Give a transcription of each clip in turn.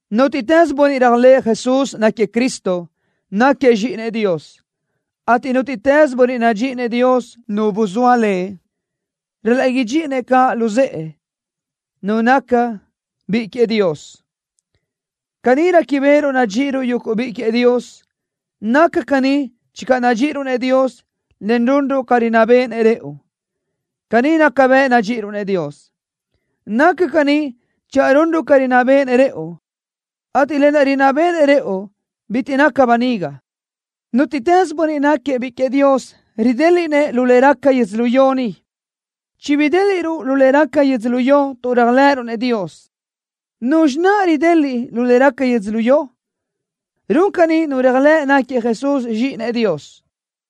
Nútiʼtës bönniʼ réajlëʼë Jesús náquiëʼ Cristo, náquiëʼ zxíʼinëʼ Dios, ateʼ nútiʼtës bönniʼ nadxíʼinëʼ Dios Nu buzóa lëʼ, ral-laʼ idxíʼinëʼ caʼ luzë́ʼë nu naca biʼi queëʼ Dios. Caní réquibeʼeruʼ nadxíʼiruʼ yuguʼ biʼi queëʼ Dios. Naca caní channö nadxíʼiruʼ-nëʼ Dios, en runruʼ ca rinná béʼenëʼ rëʼu. Caní naca bëʼ nadxíʼiruʼ-nëʼ Dios. Naca caní channö runruʼ ca rinná béʼenëʼ rëʼu, ateʼ lë naʼ rinná béʼenëʼ rëʼu bitiʼ naca böniga. Nútiʼtës bönniʼ náquiëʼ biʼi queëʼ Dios ridéliʼnëʼ lu le raca yödzölió ni. Chibidéliʼruʼ lu le raca yödzölió tuʼ réajlëʼëruʼ-nëʼ Dios. ¿Nuzxi naʼ rideliʼ lu le raca yödzölió? Run caní nu réajlëʼ náquiëʼ Jesús Zxíʼinëʼ Dios.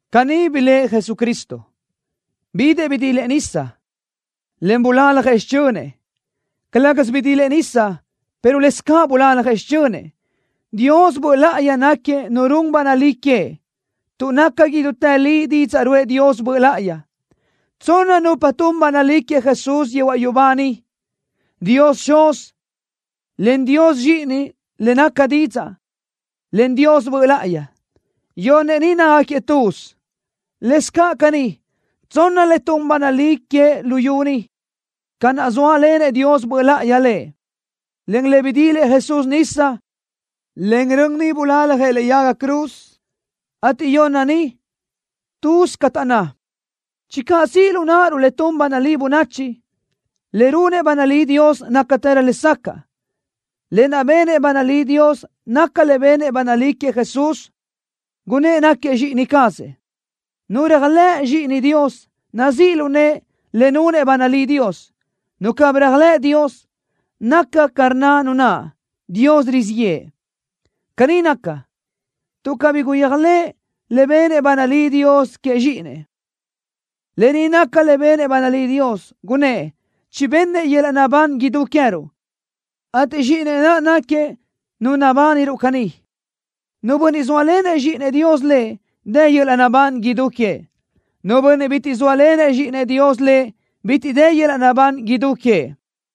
Caní blëʼë Jesucristo. Bidëʼ bidilëʼ nisa, en bulaljëʼ xichönëʼ. Calë́gasö bidilëʼ nisa, pero lëscaʼ bulaljëʼ xichönëʼ. Dios Böʼ Láʼayi náquiëʼ Nu run ba nalí queëʼ, tuʼ naca idútë li didzaʼ ruʼë Dios Böʼ Láʼayi. Tsonna nupa tun ba nalí queëʼ Jesús yehuaʼ yubá niʼ, Dios Xuz, en Dios Zxíʼini, lëʼ caʼ Didzaʼ, en Dios Böʼ Láʼayi. Yonnëʼ ni nácagaquiëʼ tuz. Lëscaʼ caní, tsonna le tun ba nalí queëʼ luyú ni, ca naʼ zóalenëʼ Dios Böʼ Láʼayi Lëʼ, en le bidilëʼ Jesús nisa, en rön niʼ bulaljëʼ lëʼe yaga cruz, ateʼ yonna ni, tuz ca taʼnná. Channö siʼ lu náʼaruʼ le tun ba nalí bönachi, le runëʼ ba nalí Dios nácatërö lesacaʼ. Lë naʼ benëʼ ba nalí Dios naca le benëʼ ba nalí queëʼ Jesús, gunnë́ʼ náquiëʼ Zxíʼini cazëʼ. Nu réajlëʼ Zxíʼinëʼ Dios, nazíʼ lu nëʼe le nunëʼ ba nalí Dios. Nu cabí réajlëʼ Dios, naca ca rnna nu naʼ: Dios rizíʼ yëʼë. Caní naca, tuʼ cabí guyéajlëʼ le benëʼ ba nalí Dios queëʼ Zxíʼinëʼ. Lë ni naca le benëʼ ba nalí Dios. Gunnë́ʼ chibennëʼ yöl-laʼ naʼbán idú queë́ruʼ, ateʼ Zxíʼinëʼ naʼ náquiëʼ Nu nabániruʼ caní. Nu bönniʼ zóalenëʼ Zxíʼinëʼ Dios lëʼ, dë yöl-laʼ naʼbán idú queëʼ. Nu bönniʼ bitiʼ zóalenëʼ Zxíʼinëʼ Dios lëʼ, bitiʼ dë yöl-laʼ naʼbán idú queëʼ.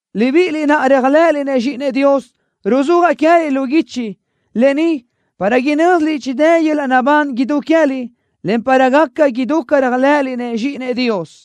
Libíʼiliʼ naʼ réajlëʼëliʼ-nëʼ Zxíʼinëʼ Dios, ruzúajaʼ queë́liʼ lu guichi lë ni para inö́ziliʼ chidë́ yöl-laʼ naʼbán idú queë́liʼ, en para gaca idú ca réajlëʼëliʼ-nëʼ Zxíʼinëʼ Dios.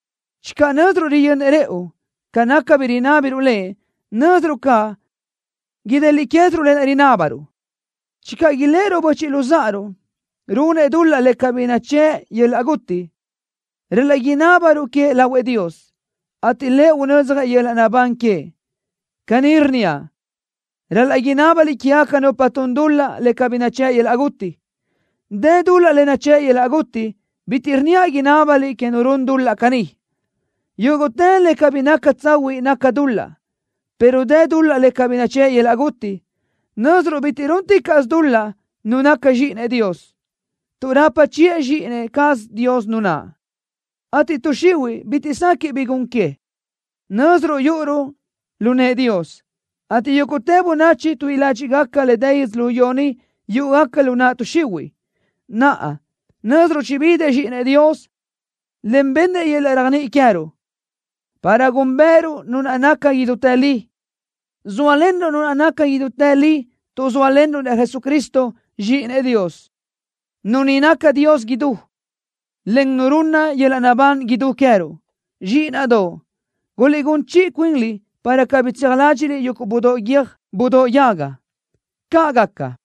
Channö nö́ziruʼ riyönnëʼ rëʼu ca naca bi rinábiruʼ Lëʼ, nö́ziruʼ caʼ ideliʼ quéziruʼ lë naʼ rinábaruʼ. Channö iléʼeruʼ böchiʼ luzáʼaruʼ runëʼ dul-laʼ le cabí nachë́ʼ yöl-laʼ guti, ral-laʼ inábaruʼ queëʼ lahuëʼ Dios, ateʼ Lëʼ unödzjëʼ yöl-laʼ naʼbán queëʼ. Caní rnníaʼ: Ral-laʼ inábaliʼ quégaca nupa tun dul-laʼ le cabí nachë́ʼ yöl-laʼ guti. Dë dul-laʼ le nachë́ʼ yöl-laʼ guti. Bitiʼ rnníaʼ inábaliʼ que nu run dul-laʼ caní. Yúguʼtë le cabí naca tsahuiʼ naca dul-laʼ, pero dë dul-laʼ le cabí nachë́ʼ yöl-laʼ guti. Nö́ziruʼ bitiʼ rúnticaʼsö dul-laʼ nu naca zxíʼinëʼ Dios, tuʼ rapa chiʼë Zxíʼini cazëʼ Dios nu naʼ, ateʼ tuʼ xihuiʼ bitiʼ sequiʼ bi gun que. Nö́ziruʼ yúʼuruʼ lu nëʼë Dios, ateʼ yúguʼtë bönachi tuíʼi ládxiʼgaca le dë yödzölió ni yúʼugaca lu naʼ tuʼ xihuiʼ. Naʼa, nö́ziruʼ chibidëʼ Zxíʼinëʼ Dios, en bennëʼ yöl-laʼ réajniʼi queë́ruʼ, para gúnbëʼëruʼ Nu naʼ naca idútë li. Zóalenruʼ Nu naʼ naca idútë li tuʼ zóalenruʼ-nëʼ Jesucristo, Zxíʼinëʼ Dios. Nu ni naca Dios idú, en Nu runna yöl-laʼ naʼbán idú queë́ruʼ. Zxíʼinaʼdoʼ, guliʼgún chiʼi cuinliʼ para cabí tseaj ládxiʼliʼ yuguʼ budóʼ guiö́j budóʼ yaga. ¡Caʼ gaca!